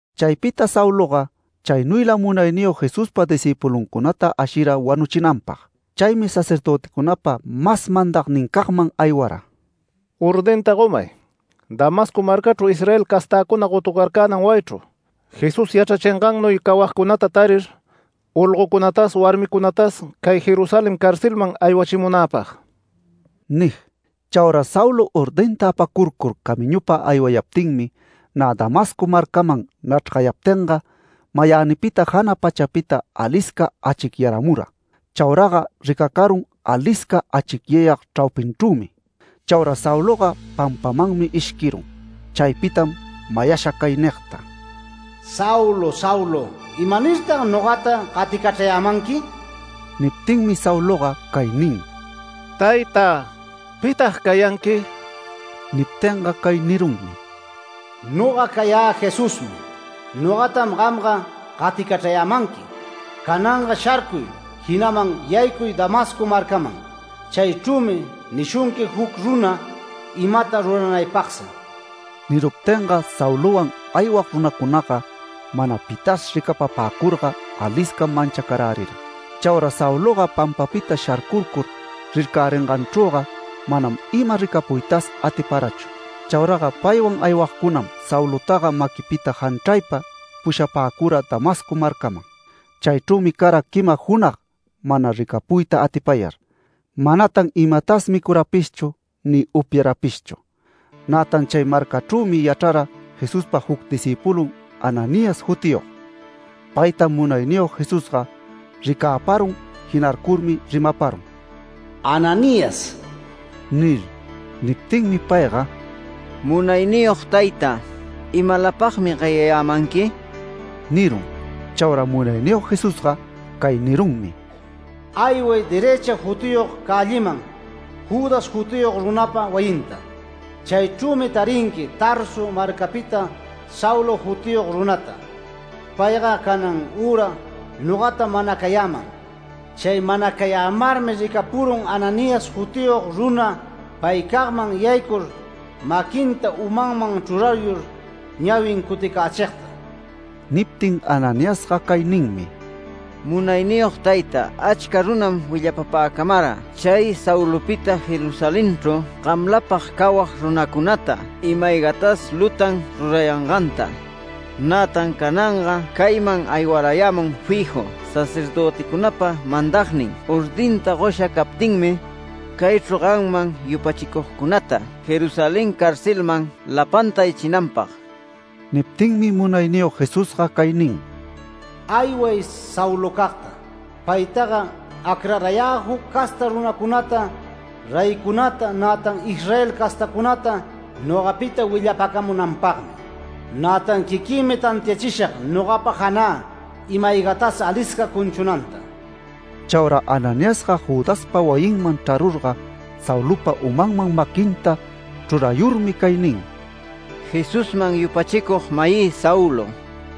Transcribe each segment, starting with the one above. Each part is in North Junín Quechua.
Chaypita Sauloga chaynuylam Munayniyog Jesuspa discïpuluncunata ashira wanuchinanpag. Chaymi sacerdöticunapa mas mandagnincagman aywara “Ordinta gomay Damasco marcachru Israel castäcuna gotucarcänan wayichru Jesús yachrachingannuy cawagcunata tarir, olgocunatas warmicunatas cay Jerusalén carcelman aywachimunäpag” nig. Chauraga Saulo ordinta apacurcur camiñupa aywayaptinmi nä Damasco marcaman nachrgayaptinga, mayänita jana pachapita alisca achicyaramura. Chauraga ricacarun alisca achicyayag chraupinchrümi. Chaura Sauloga pampamanmi ishquirun. Chaypitam mayasha cay nigta: “Saulo, Saulo, ¿imanirtag nogata gaticachrayämanqui?” Niptinmi Sauloga cay nin: “Tayta, ¿pitag cayanqui?” Niptinga cay nirunmi: “Noga cayä Jesusmi. Nogatam gamga gaticachrayämanqui. Cananga sharcuy jinaman yaycuy Damasco marcaman. Chaychrümi nishunqui juc runa imata ruranaypagsi”. Niruptinga Saulowan aywag runacunaga mana pitas ricapapäcurga aliscam manchacarärira. Chaura Sauloga pampapita sharcurcur rircäringanchrüga manam ima ricapuytas atiparachu. Chauraga paywan aywagcunam Saulotaga maquipita janchraypa pushapäcura Damasco marcaman. Chaychrümi cara quima junag mana ricapuyta atipayar, manatan imatas micurapishchu ni upyarapishchu. Nätan chay marcachrümi yachrara Jesuspa juc discïpulun Ananías jutiyog. Paytam Munayniyog Jesusga ricäparun jinarcurmi rimaparun: “Ananías” nir. Niptinmi payga “Munayniyog tayta, ¿imalapagmi gayayämanqui?” nirun. Chaura Munayniyog Jesusga cay nirunmi: “Ayway ‘Derëcha’ jutiyog cälliman Judas jutiyog runapa wayinta. Chaychrümi tarinqui Tarso marcapita Saulo jutiyog runata. Payga canan üra nogatam manacayäman. Chay manacayämarmi ricapurun Ananías jutiyog runa paycagman yaycur maquinta umanman chrurayur ñawin cuticächigta”. Niptin Ananiasga cay ninmi: “Munayniyog tayta, achca runam willapapäcamara chay Saulopita Jerusalenchru gamlapag cawag runacunata ima-aygatas lutan rurayanganta. Nätan cananga cayman aywarayämun fiju sacerdöticunapa mandagnin ordinta gosha captinmi, caychru gamman yupachicugcunata Jerusalén carcelman lapanta aywachinanpag”. Niptinmi Munayniyog Jesusga cay nin: “Ayway Saulocagta. Paytaga acrarayä juc casta runacunata, reycunata, nätan Israel castacunata nogapita willapacamunanpagmi. Nätan quiquïmi tantiachishag nogapa janä ima-aygatas alisca cunchunanta”. Chaura Ananiasga Judaspa wayinman chrarurga Saulopa umanman maquinta chrurayurmi cay nin: “Jesusman yupachicug-mayï Saulo,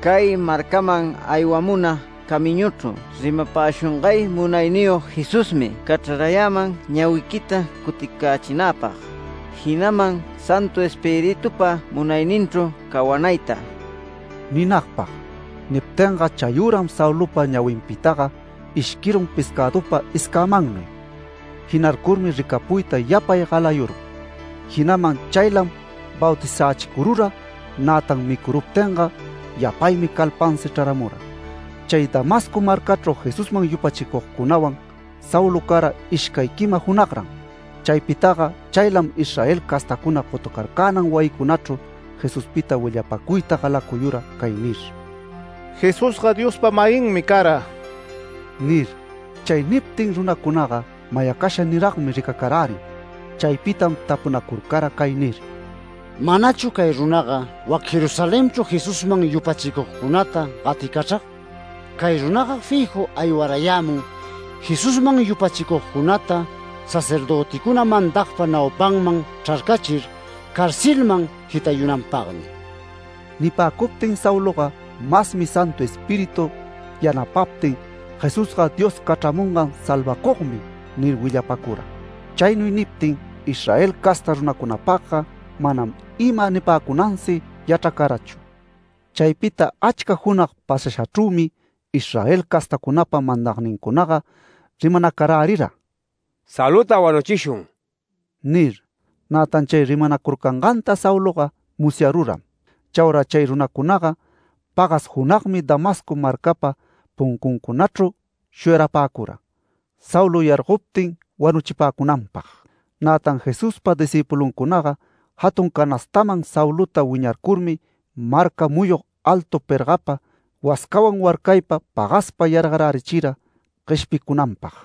cay marcaman aywamuna camiñuchru rimapäshungay Munayniyog Jesusmi cachrayäman ñawiquita cuticächinäpag, jinaman Santu Espiritupa munayninchru cawanayta” ninagpag. Niptinga chayüram Saulopa ñawinpitaga ishquirun pescädupa escämannuy. Jinarcurmi ricapuyta yapay galayurun. Jinaman chaylam bautizächicurura. Nätan micuruptinga yapaymi calpansi chraramura. Chay Damasco marcachru Jesusman yupachicugcunawan Saulo cara ishcay quima junagran. Chaypitaga chaylam Israel castacuna gotucarcänan wayicunachru Jesuspita willapacuyta galacuyura cay nir: “Jesusga Diospa-mayinmi cara” nir. Chay niptin runacunaga mayacasha niragmi ricacarärin. Chaypitam tapunacurcara cay nir: “¿Manachu cay runaga wac Jerusalenchru Jesusman yupachicugcunata gaticachrag? Cay runaga fiju aywarayämun Jesusman yupachicugcunata sacerdöticuna mandagpa naupanman chrarcachir carcelman jitayunanpagmi”. Nipäcuptin Sauloga masmi Santu Espíritu yanapaptin “Jesusga Dios cachramungan salvacugmi” nir willapacura. Chaynuy niptin Israel casta runacunapagga manam ima nipäcunansi yachracarachu. Chaypita achca junag pasashachrümi Israel castacunapa mandagnincunaga rimanacarärira: “Saulota wanuchishun” nir. Nätan chay rimanacurcanganta Sauloga musyaruram. Chaura chay runacunaga pagas junagmi Damasco marcapa puncuncunachru shuyarapäcura, Saulo yargoptin wanuchipäcunanpag. Nätan Jesuspa discïpulucunaga jatun canastaman Saulota wiñarcurmi marca muyug altu pergapa, wascawan warcaypa pagaspa yargarärichira gueshpicunanpag.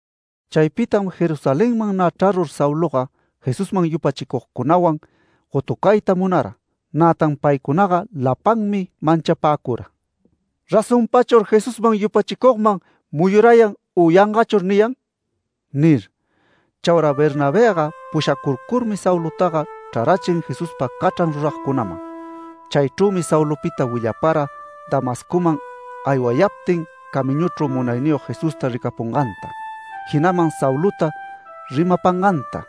Chaypitam Jerusalenman nä chrarur Sauloga, Jesusman yupachicugcunawan gotucayta munara. Nätan paycunaga lapanmi manchapäcura “¿Razonpachur Jesusman yupachicugman muyurayan u yangachur niyan?” nir. Chaura Bernabëga pushacurcurmi Saulotaga chrarachin Jesuspa cachran ruragcunaman. Chaychrümi Saulopita willapara Damascoman aywayaptin camiñuchru Munayniyog Jesusta ricapunganta, jinaman Saulota rimapanganta,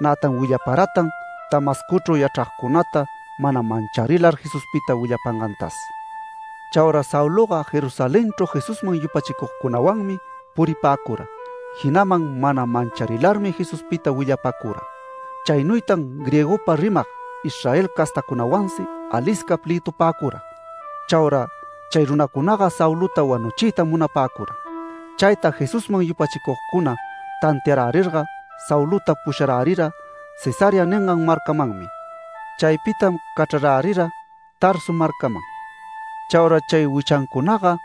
nätan willaparatan Damascochru yachragcunata mana mancharilar Jesuspita willapangantas. Chaura Sauloga Jerusalenchru Jesusman yupachicugcunawanmi puripäcura. Jinaman mana mancharilarmi Jesuspita willapacura. Chaynuytan griegopa rimag Israel castacunawansi alisca plëtupäcura. Chaura chay runacunaga Saulota wanuchiytam munapäcura. Chayta Jesusman yupachicugcuna tantiarärirga Saulota pusharärira Cesarea ningan marcamanmi. Chaypitam cachrarärira Tarso marcaman. Chaura chay wichancunaga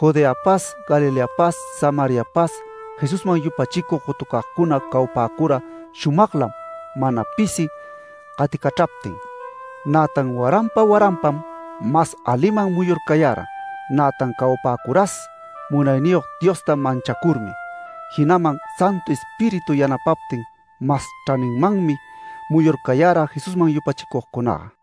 Judeapas Galileapas Samariapas Jesusman yupachicug gotucagcuna cawapäcura shumaglam mana pisi gaticachraptin. Nätan waranpa waranpam mas aliman muyurcayara, nätan cawapäcuras Munayniyog Diosta manchacurmi, jinaman Santu Espíritu yanapaptin mas chraninmanmi muyurcayara Jesusman yupachicugcunaga.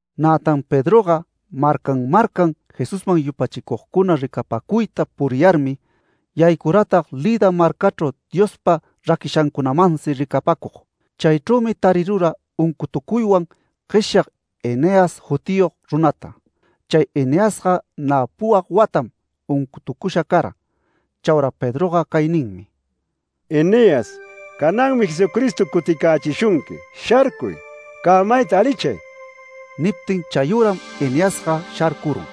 Nätan Pedroga marcan marcan Jesusman yupachicugcuna ricapacuyta puriyarmi, yaycuratag Lida marcachru Diospa raquishancunamansi ricapacug. Chaychrümi tarirura uncutucuywan gueshyag Eneas jutiyog runata. Chay Eneasga nä puwag watam uncutucusha cara. Chaura Pedroga cay ninmi: “Eneas, cananmi Jesucristo cuticächishunqui. ¡Sharcuy! ¡Cämayta alichay!” Niptin chayüram Eneasga sharcurun.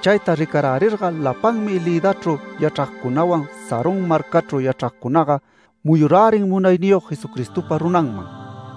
Chayta ricarärirga lapanmi Lidachru yachragcunawan Sarón marcachru yachragcunaga muyurärin Munayniyog Jesucristopa runanman.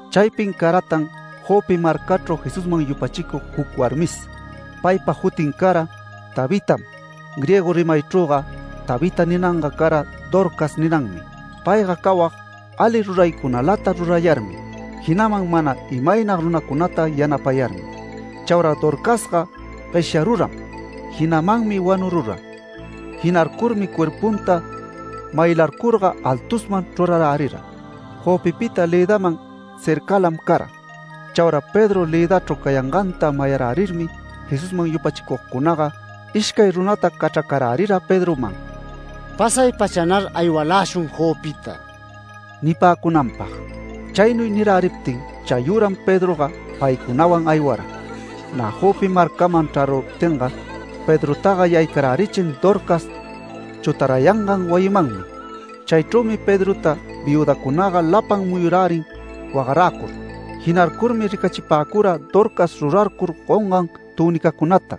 Chaypin caratan Jope marcachru Jesusman yupachicug juc warmis. Paypa jutin cara Tabitam. Griego rimaychrüga ‘Tabita’ ninanga cara ‘Dorcas’ ninanmi. Payga cawag ali ruraycunalata rurayarmi, jinaman mana imaynag runacunata yanapayarmi. Chaura Dorcasga gueshyaruram, jinamanmi wanurura. Jinarcurmi cuerpunta maylarcurga altusman chrurarärira. Jopepita Lidaman cercalam cara. Chaura Pedro Lidachru cayanganta mayarärirmi Jesusman yupachicugcunaga ishcay runata cachracarärira Pedroman “¡Pasay-pachanar aywaläshun Jopeta!” nipäcunanpag. Chaynuy niräriptin chayüram Pedroga paycunawan aywara. Nä Jope marcaman chraruptinga, Pedrotaga yaycarärichin Dorcas chutarayangan wayimanmi. Chaychrümi Pedrota viüdacunaga lapan muyurärin wagaräcur. Jinarcurmi ricachipäcura Dorcas rurarcur gongan tünicacunata,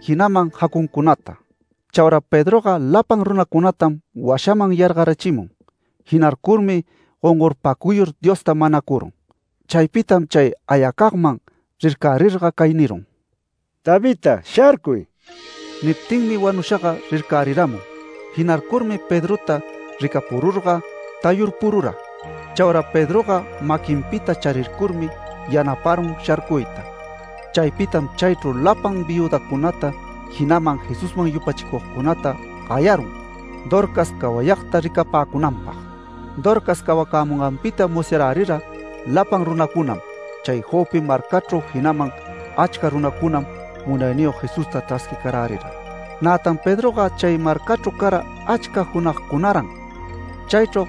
jinaman jacuncunata. Chaura Pedroga lapan runacunatam washaman yargarachimun. Jinarcurmi gongorpacuyur Diosta manacurun. Chaypitam chay ayacagman rircärirga cay nirun: “Tabita, ¡sharcuy!” Niptinmi wanushaga rircäriramun. Jinarcurmi Pedrota ricapururga tayurpurura. Chaura Pedroga maquinpita charircurmi yanaparun sharcuyta. Chaypitam chaychru lapan viüdacunata, jinaman Jesusman yupachicugcunata gayarun, Dorcas cawayagta ricapäcunanpag. Dorcas cawacämunganpita musyarärira lapan runacunam chay Jope marcachru, jinaman achca runacunam Munayniyog Jesusta chrasquicarärira. Nätan Pedroga chay marcachru cara achca junagcunaran. Chaychru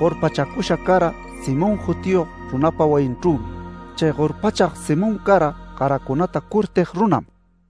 gorpachacusha cara Simón jutiyog runapa wayinchrümi. Chay gorpachag Simón cara garacunata curtig runam.